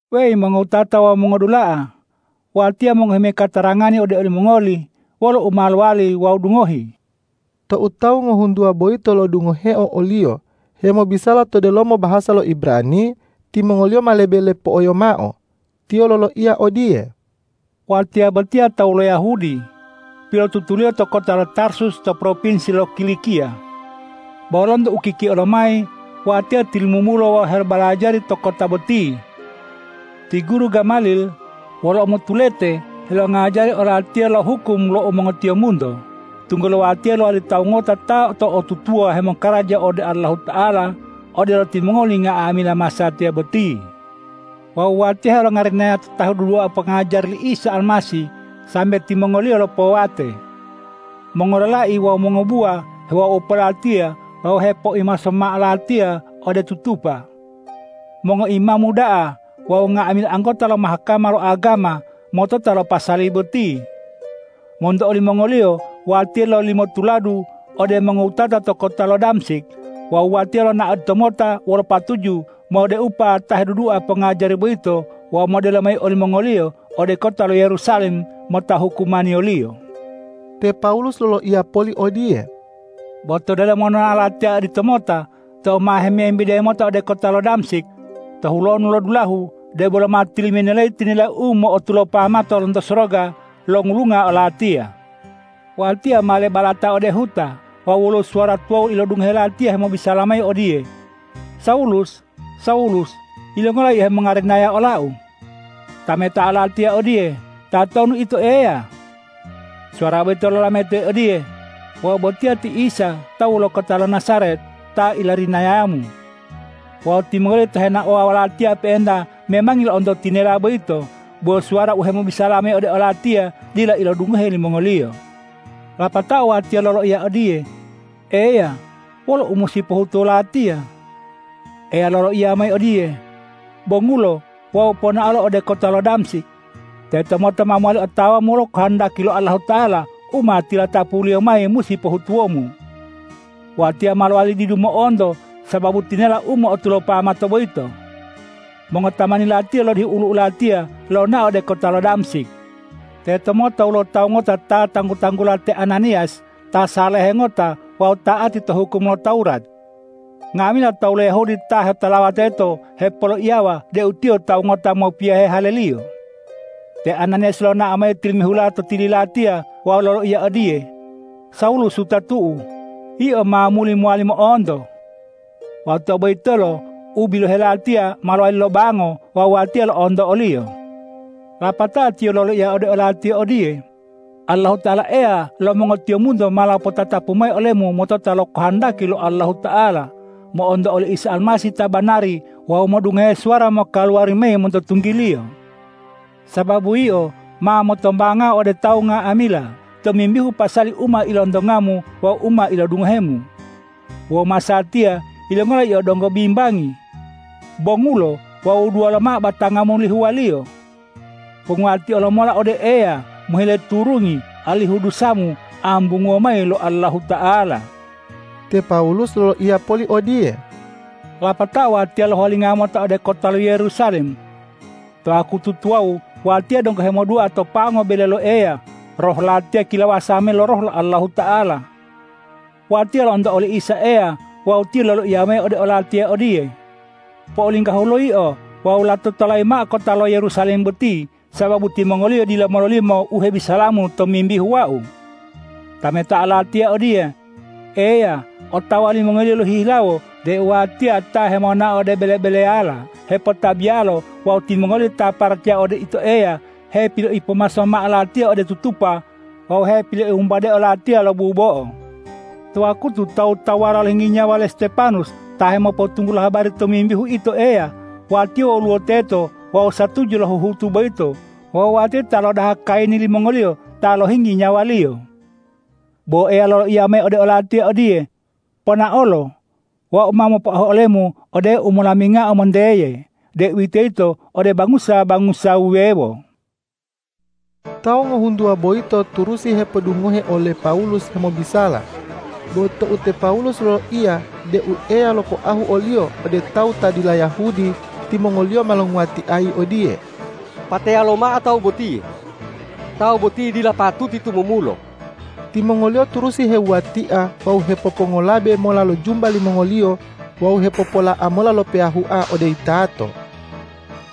”Weyi mongowutata wawu mongodula'a, watiya mongohi mayi katarangani ode olimongoli wolo u ma lowali wawu dungohi.” Tou tawu ngohuntuwa boyito lo'odungoheo oliyo hemobisala to delomo bahasa lo Ibrani, timongoliyo ma lebe lepo'oyo mao. Tiyo loloiya odiye, ”Watiya botiya tawu lo Yahudi, pilotutuliyo to kota lo Tarsus to propinsi lo Kilikiya, bo lonto ukikio lomayi watiya tilumumulo wawu helobalajari to kota boti. Ti guru Gamalil wolo umotulete helongajari olatiya lo hukum lo mongotiyombunto, tunggulo watiya lowali tawu ngota ta to'otutuwa hemokaraja ode Allahuta'ala, odelo timongoli nga'amila masatiya boti. Wawu watiya helongarinaya ta hedudua pongajari li Isa Almasih sambe timongoliyo lopowate. Mongololai wawu mongobuwa hewaupo latiya wawu hepoipomaso mao latiya ode tutupa. Mongoimamu da'a wawu nga'amila anggota lo Mahkama lo agama motota lo pasali boti. Monto olimongoliyo watiya lololimo tuladu ode mongowutata to kota lo Damsik wawu watiya lonao oditomota wolo patuju modeupa ta hedudua pongajari boyito wawu modelo mayi olimongoliyo ode kota lo Yerusalem mota hukumaniyoliyo.” Te Pawulus loloiya poli odiye,”Bo to delomo nonao latiya oditomota, tou ma hemembide mota ode kota lo Damsik, to hulonu lo dulahu, debolo ma tiliminelayi tinela u mo'otulopa mato lonto soroga longulunga olatiya. Watiya ma lebalata ode huta wawu woluwo suwara tuwawu ilodungohe latiya hemobisala mayi odiye, ’Sawulus, Sawulus! Yilongola yio hemongarinaya ola-U?’ Tametao latiya odiye, ’Tatonu Ito, Eya?’ Suwara boyito lolametayi odiye, ’Wau botiya ti Isa tawu lo kota lo Najaret ta ilarinayamu.’ Wawu timongoliyo ta henaowa wolatiya pe'enta memangi lo'onto tinela boyito, bo suwara u hemobisala mayi ode olatiya dila ilodungohe limongoliyo. Lapatao watiya loloiya odiye, ’Eya, wolo u musi pohutuwo latiya?’ Eya loloiya mayi odiye, ’Bongulo wawu ponaolo ode kota lo Damsik. Tetomota ma mowali otawamu wolo kohondaki lo Allahuta'ala u ma tilatapu-Liyo mayi musi pohutuwomu.’ Watiya ma lowali didu mo'onto sababu tinela u mo'otulopa mato boyito. Mongotamani latiya lodihu olu'u latiya lonao ode kota lo Damsik. Tetomota woluwo tawu ngota ta tanggu-tanggula te Ananiyas ta salehe ngota wawu ta'ati to hukum lo Tawurat. Nga'amila tawu lo Yahudi ta hetolawa teto hepoloiyawa deu tiyo tawu ngota mopiyohe haleliyo. Te Ananiyas lonao mayi tilimihula to tili latiya wawu loloiya odiye, ’Sawulus wutatu'u, yio ma muli mowali mo'onto!’ Wawu tou boyitolo u bilohe latiya ma lowali lobango wawu watiya lo'onto oliyo. Lapatao tiyo loloiya ode olatiya odiye, ’Allahuta'ala Eya lo mongotiyombunto ma lopotatapu mayi olemu motota lo kahandaki lo Allahuta'ala, mo'onto oli Isa Almasih ta banari wawu modungohe suwara mokaluwari mayi monto tunggi-Liyo. Sababu yio ma motombangao ode tawu nga'amila tomimbihu pasali u ma ilontongamu wawu u ma ilodungohemu. Wawu masatiya, yilongola yio donggo bimbangi? Bongulo wawu wuduwa lomao batangamu lihuwaliyo. Ponguwatio lomola ode Eya mohile turungi alihu dusamu ambunguwo mayi lo Allahuta'ala.’” Te Pawulus loloiya poli odiye,”Lapatao watiya ma lohuwalinga mota ode kota lo Yerusalem. To wakutu tuwawu watiya donggo hemodua to pango bele lo Eya, roh latiya kilawasa mayi lo Roh lo Allahuta'ala. Watiya lo'onto oli Isa Eya wawu Tiyo loloiya mayi ode olatiya odiye, ’Po'olinggahulo yio wawu lato tolayi mao kota lo Yerusalem boti, sababu timongoliyo dila mololimo u hebisalamu tomimbihu Wau.’ Tametao latiya odiye, ’Eya, otawa limongoliyo lohihilawo deu watiya ta hemonao ode bele-beleyala hepotabiyalo wawu timongoliyo ta paracaya ode Ito Eya hepiloipomaso mao latiya ode tutupa wawu hepiloiwumbadeo latiya lo bubo'o. To wakutu tawu-tawuwala lohinggi nyawa le Stepanus ta hemopotunggulo habari tomimbihu Ito Eya, watiya woluwo teto wawu satuju lo huhutu boyito wawu watiya ta lodaha kayini limongoliyo ta lohinggi nyawaliyo.’ Bo Eya loloiya mayi ode olatiya odiye, ’Ponaolo! Wau ma mopoahu olemu ode umolamingao monteye, deuwitoyito ode bangusa-bangusa wuwewo.’” Tawu ngohuntuwa boyito turusi hepodungohe ole Pawulus hemobisala. Bo tou te Pawulus loloiya deu Eya lopoahu oliyo ode tawu ta dila Yahudi, timongoliyo ma longuwatiayi odiye,”Pateya lomao tawu botiye! Tawu boti dila patuti tumumulo!” Timongoliyo turusi hewuwatia wawu hepopongolabe mola lo jumba limongoliyo wawu hepopola'a mola lo peyahua ode yitato.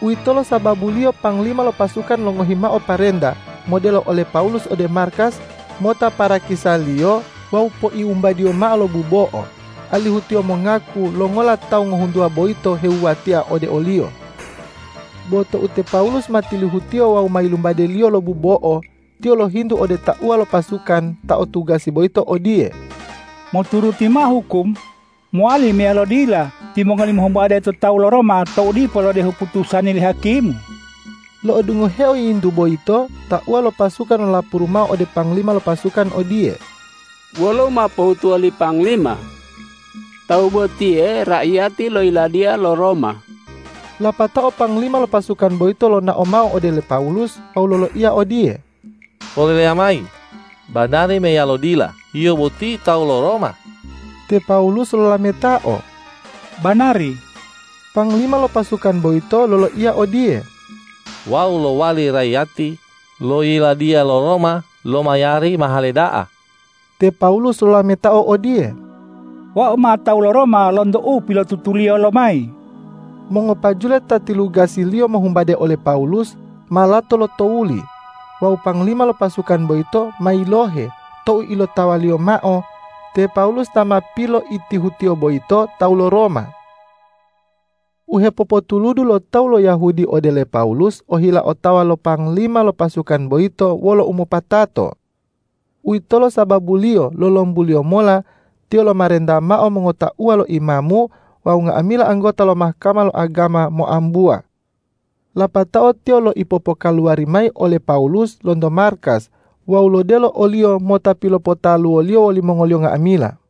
Uwitolo sababuliyo panglima lo pasukan longohi mao parenta modelo ole Pawulus ode markas mota parakisaliyo wawu poiwumbadiyo mao lo bubo'o, alihu tiyo mongaku longola tawu ngohuntuwa boyito hewuwatia ode oliyo. Bo tou te Pawulus ma tilihutiyo wawu ma wumbadeliyo lo bubo'o, tiyo lohintu ode tauwa lo pasukan ta o tugasi boyito odiye,”Moturuti mao hukum, mowali meyalo dila timongoli mohumbade to tawu lo Roma tou dipo lodehu putusani li hakimu?” Lo'odungoheo yiyintu boyito, tauwa lo pasukan lolapuru mao ode panglima lo pasukan odiye,”Wolo u ma pohutuwo li panglima? Tawu botiye raiyati lo yiladiya lo Roma.” Lapatao panglima lo pasukan boyito lonao mao ode le Pawulus wawu loloiya odiye,”Poleleya mayi, banari meyalo dila yio boti tawu lo Roma?” Te Pawulus lolametao,”Banari.” Panglima lo pasukan boyito loloiya odiye,”Wau lowali raiyati lo yiladiya lo Roma lomayari mahale da'a.” Te Pawulus lolametao odiye,”Wau ma tawu lo Roma lonto u pilotutuliyo lomayi.” Mongopajule ta tilugasiyaliyo mohumbade ole Pawulus, ma lato lotowuli wawu panglima lo pasukan boyito ma yilohe tou ilotawaliyo mao te Pawulus ta ma piloitihutiyo boyito tawu lo Roma. U hepopotuludu lo tawu lo Yahudi ode le Pawulus ohila otawa lo panglima lo pasukan boyito wolo umopatato. Uwitolo sababuliyo lolombuliyo mola tiyo lomarenta mao mongotauwa lo imamu wawu nga'amila anggota lo Mahkama lo agama moambuwa. Lapatao tiyo loipopokaluwari mayi ole Pawulus lonto markas wawu lodelo oliyo mota pilopotaluwoliyo wolimongoliyo nga'amila.